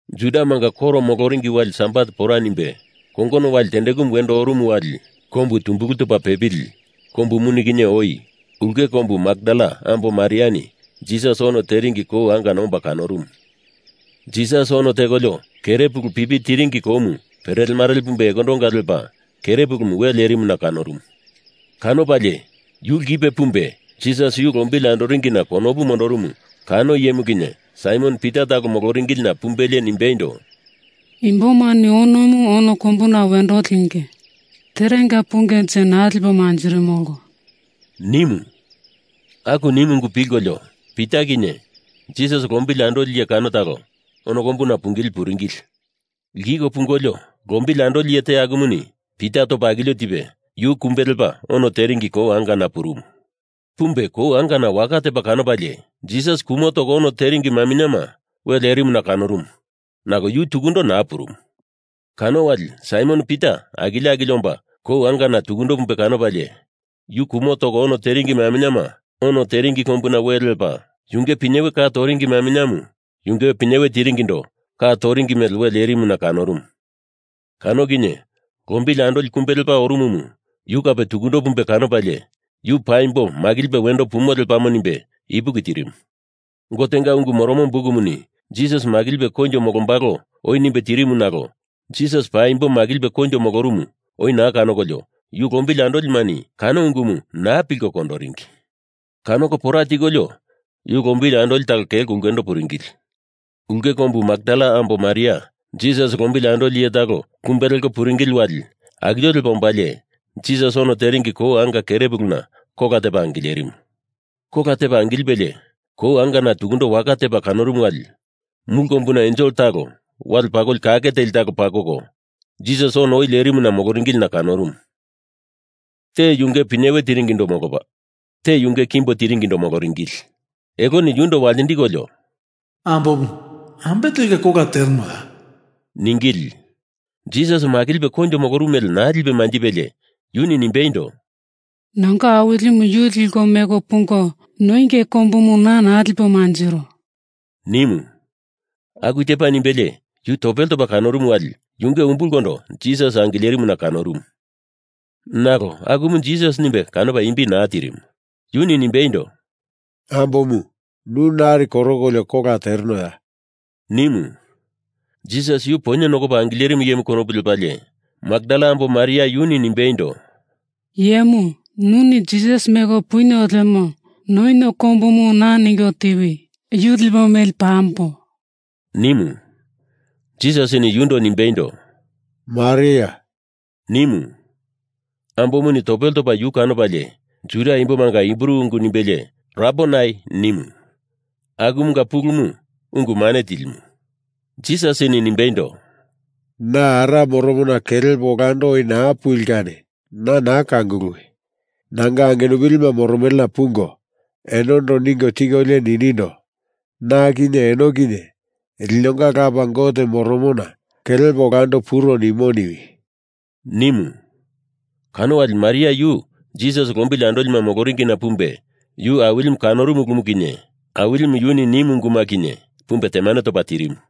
Judamanga koro moloringi wali Sabat pora nimbe, kongono wali tendekumu wendo orumu wali kombu tumbulu topa pepili kombu muni kinye oi ulke kombu Makdala ambo Mariani Jisas ono teringi kou angana omba kanorumu. Jisas ono tekolio kere pulu pipi tiringi koumu perelemarele pumbe ekondonga lepa kere pulumu we lerimuna kanorumu. Kanopalie yu lkipe pumbe Jisas yu lombili andoringina konopu mondorumu kano iyemu kinye Saimon Pita talo moloringilina pumbelie nimbeindo, “Imbomani onomu ono kombuna wendo linge. Terenga pungenje naa lipo manjirimolo,” nimu. Aku nimu ungu pilkolio Pita kinye Jisas lombili andoli iye kano talo ono kombuna pungili puringili. Lkiko pungolio, lombili andoli iye te akumuni Pita topa akilio tipe yu kumbe lepa ono teringi kou angana purumu. Pumbe kou angana waka tepa kanopalie Jisas kumo toko ono teringi maminyema we lerimuna kanorumu, nalo yu tukundo naa purumu. Kano wali Saimon Pita akilio akilio omba kou angana tukundo pumbe kanopalie, yu kumo toko ono teringi maminyema ono teringi kombuna we lepa, yunge pinyewena ka toringi maminyemu yunge pinyewe tiringindo ka toringi mele we lerimuna kanorumu. Kano kinye lombili andoli kumbe lepa orumumu yu kape tukundo pumbe kanopalie, yu paimbo makilipe wendo pumo lepamo nimbe ipuki tirimu. Gotenga Ungu Moromo Bukumuni Jisas makilipe koinjo molombalo oi nimbe tirimu nalo Jisas paimbo makilipe koinjo molorumu oi naa kanokolio yu lombili andolimani kano ungumu naa pilko kondoringi. Kanoko pora tikolio yu lombili andoli talo kelko ulkendo puringili. Ulke kombu Makdala ambo Maria Jisas lombili andoli iye talo kumbe leko puringili wali akilio lepa ombalie Jisas ono teringi kou anga kere puluna kola tepa angilerimu. Kola tepa angilipelie kou angana tukundo waka tepa kanorumu wali mulu kombuna ensel talo wale pakoli kake teli talo pakoko Jisas ono oi lerimuna moloringilina kanorumu. Te yunge pinyewe tiringindo molopa, te yunge kimbo tiringindo moloringili. Eloni yundo waltindikolio, “Ambomu, ambe telka kola terenoya?” ningili. Jisas makilipe koinjo molorumu mele naa lipe manjipelie yuni nimbeindo, “Nanga Awilimu yu liko meko pungo noienge kombumu na naa lipo manjiro,” nimu. Aku tepa nimbelie yu topele topa kanorumu wali yunge umbulkondo Jisas angilerimuna kanorumu. Nalo akumu Jisas nimbe kanopa imbi naa tirimu. Yuni nimbeindo, “Ambomu, nu nari korokolio kola terenoya?” nimu. Jisas yu poinye nokopa angilerimu iyemu konopu lepalie Makdala ambo Maria yuni nimbeindo, “Iyemu, nuni Jisas meko punio lemo noinio kombumu na ningo tiwi! Yu lipo meli pambo!” nimu. Jisasini yundo nimbeindo, “Mariaya,” nimu. Ambomuni topele topa yu kanopalie Juda imbomanga Hibru ungu nimbelie ‘Rabonai,’ nimu. Akumunga pulumu Ungu Mane Tilimu. Jisasini nimbeindo, “Na Ara moromona kelepo olando oi naa puli kani na naa kanguluwi! Nanga angenupilima moromelena pungo enondo ningo tikolio ninindo, Na kinye eno kinye linonga Lapa Gote moromona kelepo olando puro nimo niwi!” nimu. Kano wali Maria yu Jisas lombili andolima moloringina pumbe yu Awilimu kanorumu ulumu kinye Awilimu yuni nimu unguma kinye pumbe temane topa tirimu.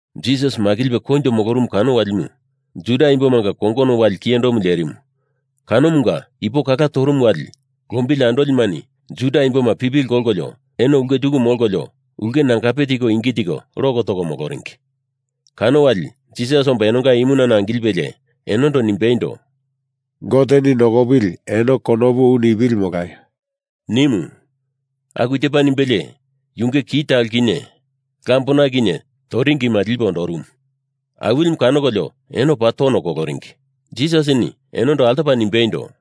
Jisas makilipe koinjo molorumu kano walimu Juda imbomanga kongono wali kiyendo lerimu kanomunga ipo kala torumu wali lombili andolimani Juda imboma pipili kolkolio eno ulke tuku molkolio ulke nangape tiko ingi tiko lok toko moloringi. Kano wali Jisas omba enonga imunana angilipe enondo nimbeindo, “Goteni nokopili eno konopu u nipili molaio!” nimu. Aku tepa nimbelie, yunge ki talo kinye lambona kinye toringima lipe ondorumu. Awilimu kanokolio enoni paa tono koloringi. Jisasini enondo altopa nimbeindo,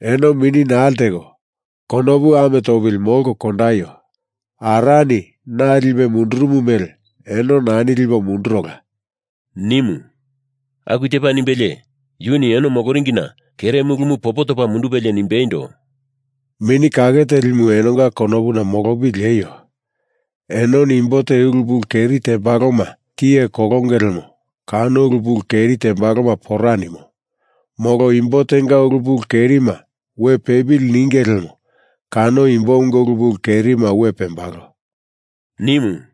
“Eno mini naa lteko konopu ame topili molko kandaio! Arani na lipe mundurumu mele eno nani lipo mundurola,” nimu. Aku tepa nimbelie yuni eno moloringina kere mulumu popo topa mundupelie nimbeindo, “Mini Kake Telimu enonga konopuna molopili lieio! Enoni imbo te ulu pulu keri tembaloma tiye kolonge lemo kano ulu pulu keri tembaloma pora nimo. Molo imbo tenga ulu pulu kerima we pepili ninge lemo kano imbomunga ulu pulu kerima we pembalo,” nimu.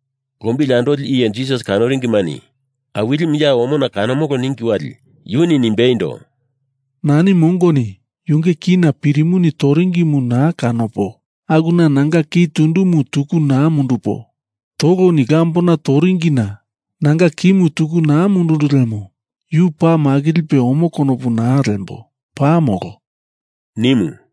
Lombili andoli iye Jisas kanoringimani Awilimu ya omona kanomolo ningi wali yuni nimbeindo, “Nani mongoni yunge kina pirimuni toringimu naa kanopo akuna nanga ki tundumu tuku naa mundupo, toloni lambona toringina nanga kimu tuku naa mundundu lemo yu paa makilipe omo konopu naa lembo, paa molo,” nimu.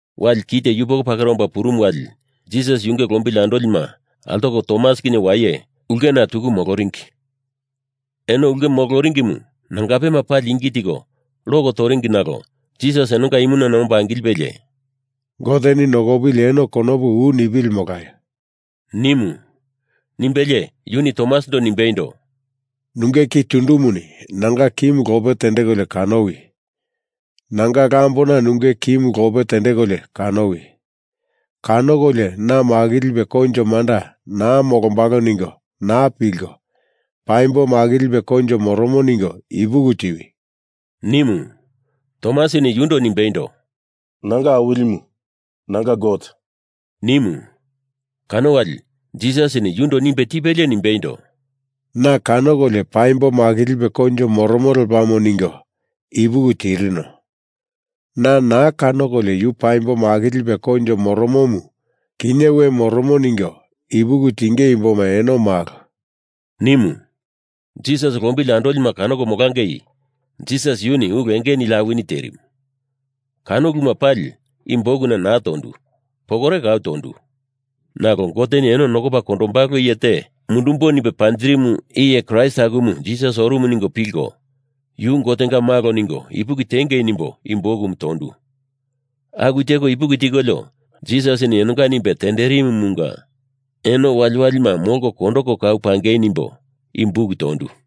Wali kite yupoko pakera omba purumu wali Jisas yunge lombili andolima altoko Tomas kinye waye ulkena tuku moloringi. Eno ulke moloringimu nangapema pali ingi tiko lok toringi nalo Jisas enonga imunana omba angilipelie, “Goteni nokopili eno konopu u nipili molaio!” nimu. Nimbelie yuni Tomasindo nimbeindo, “Nunge ki tundumuni nanga kimu lope tendekolio kanowi! Nanga lambona nunge kimu lope tendekolio kanowi! Kanokolio na makilipe koinjo manda naa molombalo ningo naa pilko, paimbo makilipe koinjo moromo ningo ipuki tiwi!” nimu. Tomasini yundo nimbeindo, “Nanga Awilimu, nanga Gote,” nimu. Kano wali Jisasini yundo nimbe tipelie nimbeindo, “Na kanokolio paimbo makilipe koinjo moromo lepamo ningo ipuki tirino. Na naa kanokolio yu paimbo makilipe koinjo molorumu kinye we moromo ningo ipuki tinge imboma eno malo,” nimu. Jisas lombili andolima kanoko molangei Jisas yuni ulu enge nili awini terimu, kano uluma pali i bukuna naa tondu, pokore kau tondu. Nalo Goteni eno nokopa kondombalo iye te mundumbo nimbe panjirimu iye Kraist akumu Jisas orumu ningo pilko, yu Gotenga malo ningo ipuki tingei nimbo i bukumu tondu. Aku teko ipuki tikolio Jisasini enonga nimbe tenderimumunga eno waliwalima molko kondoko kau pangei nimbo i buk tondu.